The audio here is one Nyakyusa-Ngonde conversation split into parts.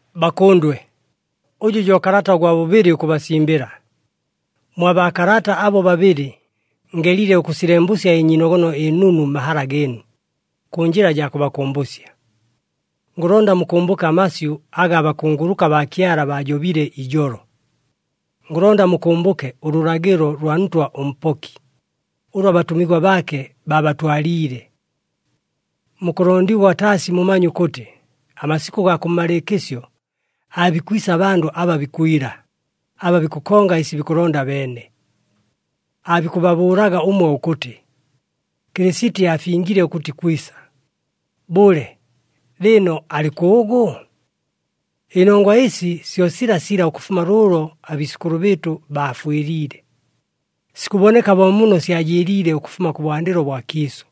Bakʉndwe, ʉjʉ jo kalata ʉgwa bʉbɨlɨ ʉkʉbasimbɨla. Mwa baakalata abo babɨlɨ, ngelile ʉkʉsilembʉsya ɨnyiinogono ɨnunu mmahala gɨɨnu, kʉ njɨla jaa kʉbakʉmbʉsya. Ngʉlonda mukʉmbʉke amasyʉ aga abakunguluka baa Kyala baajobile ijolo. Ngʉlonda mukʉmbʉke ʉlʉlagɨlo lwa Ntwa ʉMpoki, ʉlʉ abatʉmigwa baake baabatwaliile. Mukʉlondigwa taasi mumanye ʉkʉtɨ amasikʉ gaa kʉmmalɨɨkɨsyo aabikwisa abandʉ aba bikwila, aba bikʉkonga ɨsi bikʉlonda abeene. Aabikʉbabʉʉlaga ʉmwe ʉkʉtɨ, “Kɨlɨsiti aafingile ʉkʉtɨ ikwisa! Bʉle, lɨɨno alɨ kʉʉgʉ? Ɨnongwa ɨsi syo silasila ʉkʉfuma lʉʉlo abiisʉkʉlʉ bɨɨtʉ baafwɨliile. Sikʉboneka bo muumo syajɨɨliile ʉkʉfuma kʉbwandɨlo bwa kiisʉ!”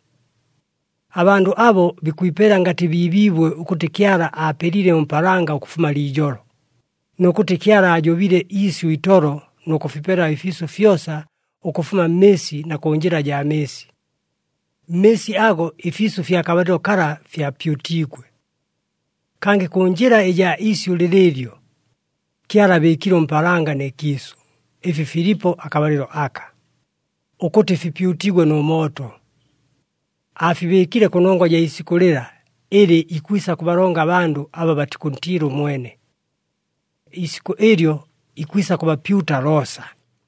Abandʉ abo bikwipela ngatɨ biibiibwe ʉkʉtɨ Kyala aapelile ʉmpaalanga ʉkʉfuma liijolo, nʉ kʉtɨ Kyala aajobile iisyʉ itolo nʉ kʉfipela ɨfiisʉ fyosa ʉkʉfuma mmɨɨsi na kʉ njɨla jaa mɨɨsi. Mmɨɨsi ago ɨfiisʉ fya kabalɨlo kala fyapyutiigwe. Kangɨ kʉ njɨla ɨjaa isyʉ lɨlɨɨlyo, Kyala aabɨɨkile ʉmpaalanga nɨ kiisʉ, ɨfi filipo akabalɨlo aka, ʉkʉtɨ fipyutigwe nʉ mooto. Aafibɨɨkile kʉnongwa jaa isikʉ lɨla ɨlɨ ikwisa kʉbalonga abandʉ aba batikʉntiila ʉmwene. Iisikʉ ɨlyo ikwisa kʉbapyuta loosa.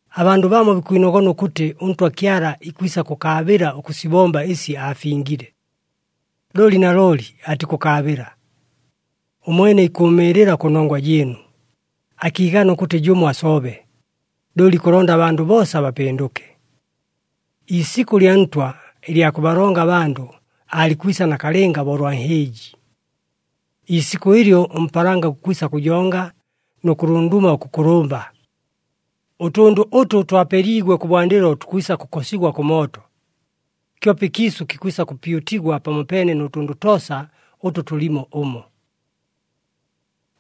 Abandʉ bamo bikwinogona ʉkʉtɨ ʉNtwa Kyala ikwisa kʉkaabɨla ʉkʉsibomba ɨsi aafingile, looli nalooli atikʉkaabɨla. Ʉmwene ikʉʉmɨɨlɨla kʉnongwa jɨɨnu, akiigana ʉkʉtɨ jʉmo asobe, looli ikʉlonda abandʉ boosa bapɨndʉke. Iisikʉ lya Ntwa ɨlya kʉbalonga abandʉ aalikwisa nakalɨnga bo ʉlwa nhɨɨji. Iisikʉ ɨlyo ʉmpaalanga gukwisa kʉjonga nʉ kʉlunduma ʉkʉkʉlʉmba, ʉtʉndʉ ʉtʉ twapeliigwe kʉbwandɨlo tukwisa kʉkosigwa kʉ mooto, kyope ɨkiisʉ kikwisa kʉpyutigwa pamopeene nʉ tʉndʉ toosa ʉtʉ tʉlimo ʉmo.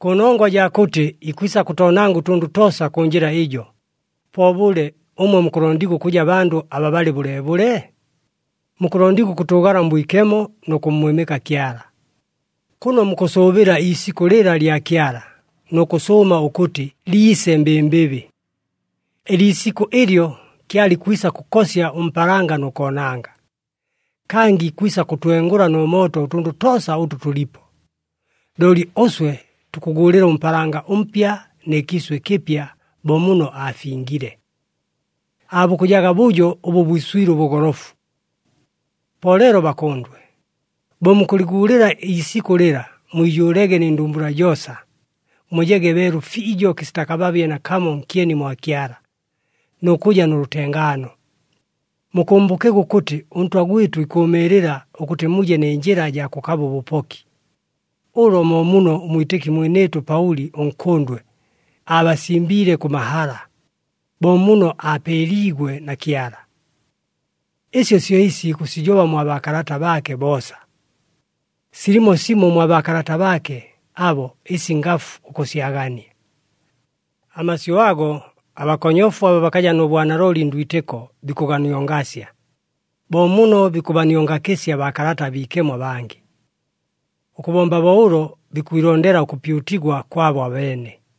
Kʉnongwa jaa kʉtɨ ikwisa kʉtoonanga ʉtʉndʉ toosa kʉ njɨla ɨjo, po bʉle ʉmwe mukʉlondigwa ʉkʉja bandʉ aba balɨ bʉleebʉle? Mukʉlondigwa ʉkʉtʉʉgala mbwikemo nʉ kʉmmwɨmɨka Kyala, kʉno mukʉsʉʉbɨla iisikʉ lɨla lya Kyala nʉ kʉsʉʉma ʉkʉtɨ liise mbɨmbɨbɨ. Ɨliisikʉ ɨlyo Kyala ikwisa kʉkosya ʉmpaalanga nʉ koonanga, kangɨ ikwisa kʉtwengʉla nʉ mooto ʉtʉndʉ toosa ʉtʉ tʉlipo. Looli ʉswe tukʉguulɨla ʉmpaalanga ʉmpya nɨ kiisʉ ɨkɨpya bo muno aafingiile. Aabukʉjaga bʉjo ʉbʉ bwiswile ʉbʉgolofu. Po leelo bakʉndwe, bo mukʉlɨguulɨla iisikʉ lɨla, mwijʉʉlege nɨ ndumbula joosa, mujege beelu fiijo kɨsita kababye nakamo nkyeni mwa Kyala, nʉ kʉja nʉ lʉtengaano. Mukʉmbʉkege ʉkʉtɨ ʉNtwa gwɨtʉ ikʉʉmɨɨlɨla ʉkʉtɨ muje nɨ njɨla jaa kʉkaba ʉbʉpoki. Ʉlo mo muno ʉmwitɨki mwinɨɨtʉ Paʉli ʉnkʉndwe aabasimbiile kʉ mahala, bo muno aapeeliigwe na Kyala. Ɨsyo syo ɨsi ikʉsijoba mwa baakalata baake boosa. Silimo simo mwa baakalata baake abo ɨsi ngafu ʉkʉsyagania. Amasyʉ ago, abakonyofu aba bakaja nʉ bwanalooli ndwitɨko bikʉganiongasya, bo muno bikʉbaniongakɨsya Baakalata aBiikemo abangɨ. Ʉkʉbomba bo ʉlo, bikwilondela ʉkʉpyutigwa kwabo abeene.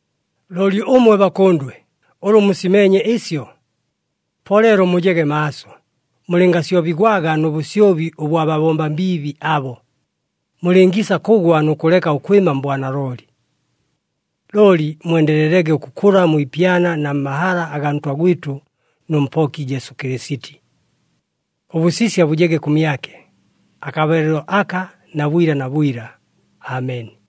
Looli ʉmwe bakʉndwe, ʉlʉ musimeenye ɨsyo. Po leelo mujege maaso, mulɨngasyobigwaga nʉ bʉsyobi ʉbwa babomba mbiibi abo, mulɨngiisa kʉgwa nʉ kʉleka ʉkwɨma mbwanalooli. Looli mwendelelege ʉkʉkʉla mwi ipyana na mmahala agaa Ntwa gwɨtʉ nʉ Mpoki Jesu Kɨlɨsiti. Ʉbʉsisya bʉjege kʉmyake, akabalɨlo aka na bwila na bwila! Ameni.